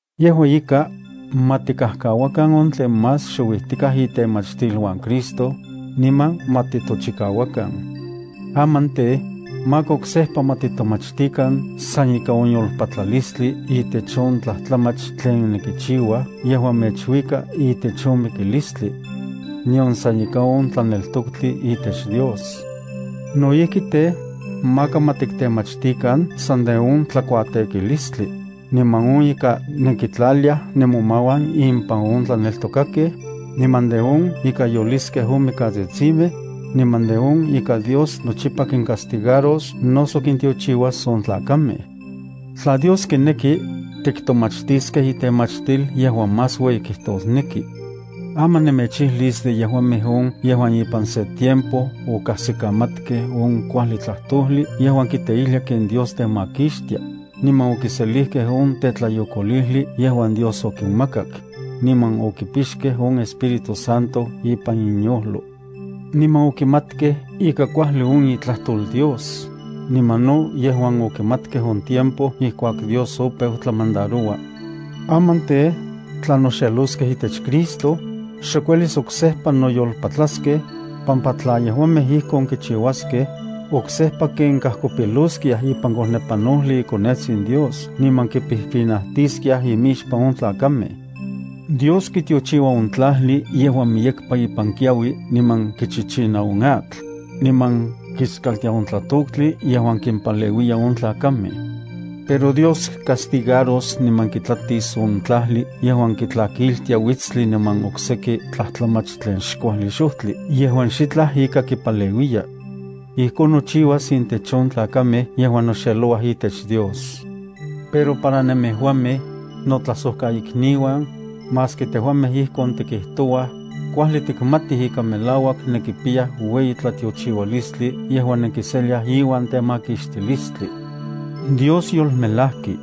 Yejua ika, ma tikajkauakan on tlen más xouijtikaj itemachtiluan Cristo, niman ma titochikauakan. Aman tej, maka oksejpa ma titomachtikan san ika on yolpatlalistli itech on tlajtlamach tlen nenkichiuaj yejuan mechuikaj itech on mikilistli, nion san ika on tlaneltoktli itech Dios. No ijki tej, maka ma tiktemachtikan san de on tlakuatekilistli, niman on ika nenkitlaliaj nemomauan impan on tlaneltokakej, niman de on ika yoliskej on mikatsitsimej, niman de on ika Dios nochipa kincastigaros noso kintiochiuas on tlakamej. Tla Dios kineki, tiktomachtiskej itemachtil yejuan más ueyi kijtosneki. Aman nemechijlis de yejuamej on yejuan ipan se tiempo okajsikamatkej on kuajli tlajtojli yejuan kiteijlia ken Dios temakixtia, niman okiselijkej on tetlayokolijli yejuan Dios okinmakak, niman okipixkej on Espíritu Santo ipan inyojlo, niman okimatkej ika kuajli on itlajtol Dios, niman no yejuan okimatkej on tiempo ijkuak Dios opeu tlamandaroua. Aman tej, tla noxeloskej itech Cristo, xok uelis oksejpa noyolpatlaskej, pampa tla yejuamej ijkon kichiuaskej, oksejpa ken kajkopiloskiaj ipan kojnepanojli iKonetsin Dios niman kipijpinajtiskiaj imixpan on tlakamej. Dios kitiochiua on tlajli yejuan miyekpa ipan kiaui niman kichichina on atl, niman kiskaltia on tlatoktli yejuan kimpaleuiya on tlakamej. Pero Dios castigaros niman kitlatis on tlajli yejuan kitlakiltia uitstli niman okseki tlajtlamach tlen xkuajli xojtli yejuan xitlaj ika tepaleuiya. Ijkon nochiuas intech on tlakamej yejuan noxelouaj itech Dios. Pero para nemejuamej, notlajsojkaikniuan, maski tejuamej ijkon tikijtouaj, kuajli tikmatij ika melauak nenkipiyaj ueyi tlatiochiualistli yejuan nenkiseliaj iuan temakixtilistli. Dios yolmelajki.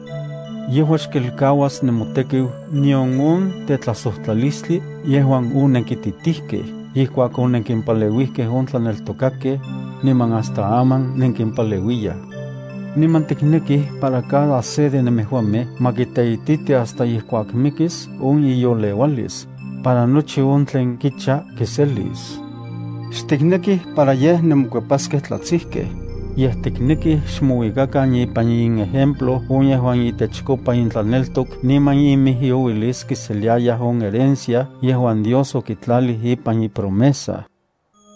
Yejua xkelkauas nemotekiu nion on tetlajsojtlalistli yejuan onenkititijkej ijkuak onenkimpaleuijkej on tlaneltokakej, niman hasta aman nenkimpaleuiyaj. Niman tiknekij para cada se de nemejuamej ma kiteititi hasta ijkuak mikis on iyoleualis, para nochi on tlen kicha kiselis. Xtiknekij para yej nemokuepaskej tlatsijkej, yej tiknekij xmouikakan ipan inejemplo on yejuan itechkopa intlaneltok niman inijyouilis kiseliayaj on herencia yejuan Dios okitlalij ipan ipromesa.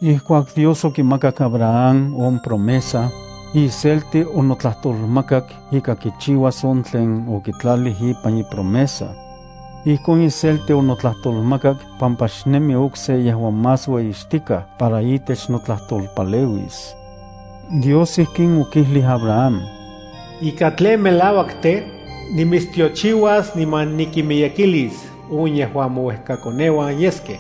Ijkuak Dios okimakak Abraham on promesa, iselti onotlajtolmakak ika kichiuas on tlen okitlalij ipan ipromesa. Ijkon iselti onotlajtolmakak pampa xnemi okse yejuan más ueyixtikaj para itech notlajtolpaleuis. Dios ijkin okijlij Abraham: “Ika tlen melauak tej, nimitstiochiuas niman nikinmiyekilis on yejuan mouejkakoneuan yeskej.”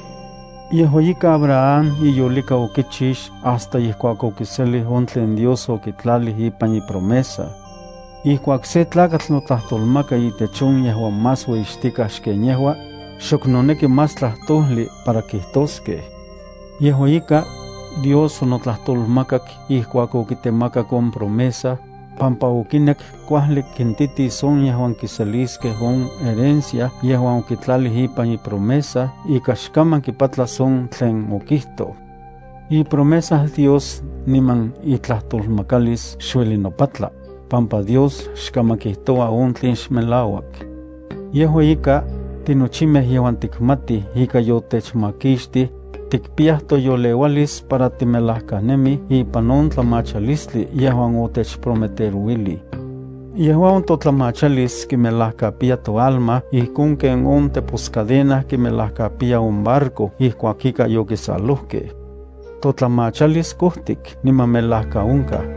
Yejua ika Abraham iyolika okichix hasta ijkuak okiselij on tlen Dios okitlalij ipan ipromesa. Ijkuak sen tlakatl notlajtolmaka itech on yejuan más ueyixtikaj xken yejua, xok noneki más tlajtojli para kijtoskej. Yejua ika, Dios onotlajtolmakak ijkuak okitemakak on promesa, pampa okinek kuajli kintitis on yejuan kiseliskej on herencia yejuan okitlalij ipan ipromesa ika xkaman kipatlas on tlen okijtoj. Ipromesa Dios niman itlajtolmakalis xueli nopatla, pampa Dios xkaman kijtoua on tlen xmelauak. Yejua ika, tinochimej yejuan tikmatij ika yotechmakixtij, tikpiyaj toyoleualis para timelajkanemij ipan on tlamachalistli yejuan otechprometerouilij. Yejua on totlamachalis kimelajkapiya toalma ijkon ken on teposcadena kimelajkapiya on barco ijkuak ika yokisalojkej. Totlamachalis kojtik niman melajkaonkaj.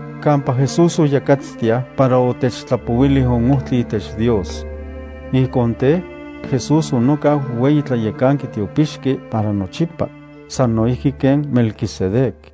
kampa Jesús oyakatstiaj para otechtlapouilij on ojtli itech Dios. Ijkon tej, Jesús onokau ueyi tlayekanki tiopixki para nochipa sano ijki ken Melquisedec.